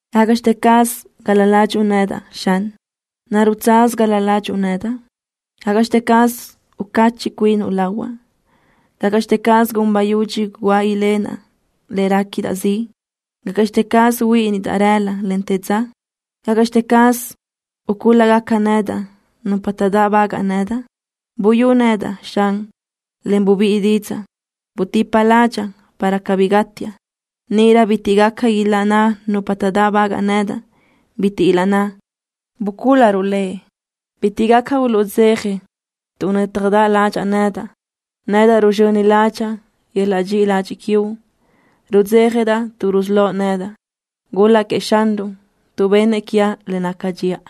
¿Gácaʼxte caz gal-la ládxuʼu nedaʼ, Xan? ¿Naruʼ tsaz gal-la ládxuʼu nedaʼ? ¿Gácaʼxte caz ucacheʼ cuinuʼ lahuaʼ? ¿Gácaʼxte caz gun bayudxi guáʼ ilenaʼ le réquidaʼ ziʼ? ¿Gácaʼxte caz huíʼinidaʼ rëla, en te dza? ¿Gácaʼxte caz ucúl-lágaca nedaʼ nupa taʼdáʼbagaʼ nedaʼ? Buyú nedaʼ, Xan, en bubíʼi didzaʼ. Butipa ládxaʼa para cabí gátiaʼ. Níʼirö bitiʼ gaca ilaʼnná nupa taʼdáʼbagaʼ nedaʼ, bitiʼ ilaʼnná: “Bucúl-laruʼ lëʼ.” Bitiʼ gaca uluʼdzeja tuʼ nö́tjadaʼ ládxaʼa nedaʼ. Nedaʼ ruzxöni ládxaʼa yöl-laʼ dxiʼi ladxiʼ quiuʼ. Rudzéjadaʼ tuʼ rusölóʼ nedaʼ. Gul-laʼ queëʼ Xanruʼ, tuʼ benëʼ quiaʼ le naca dxiʼa.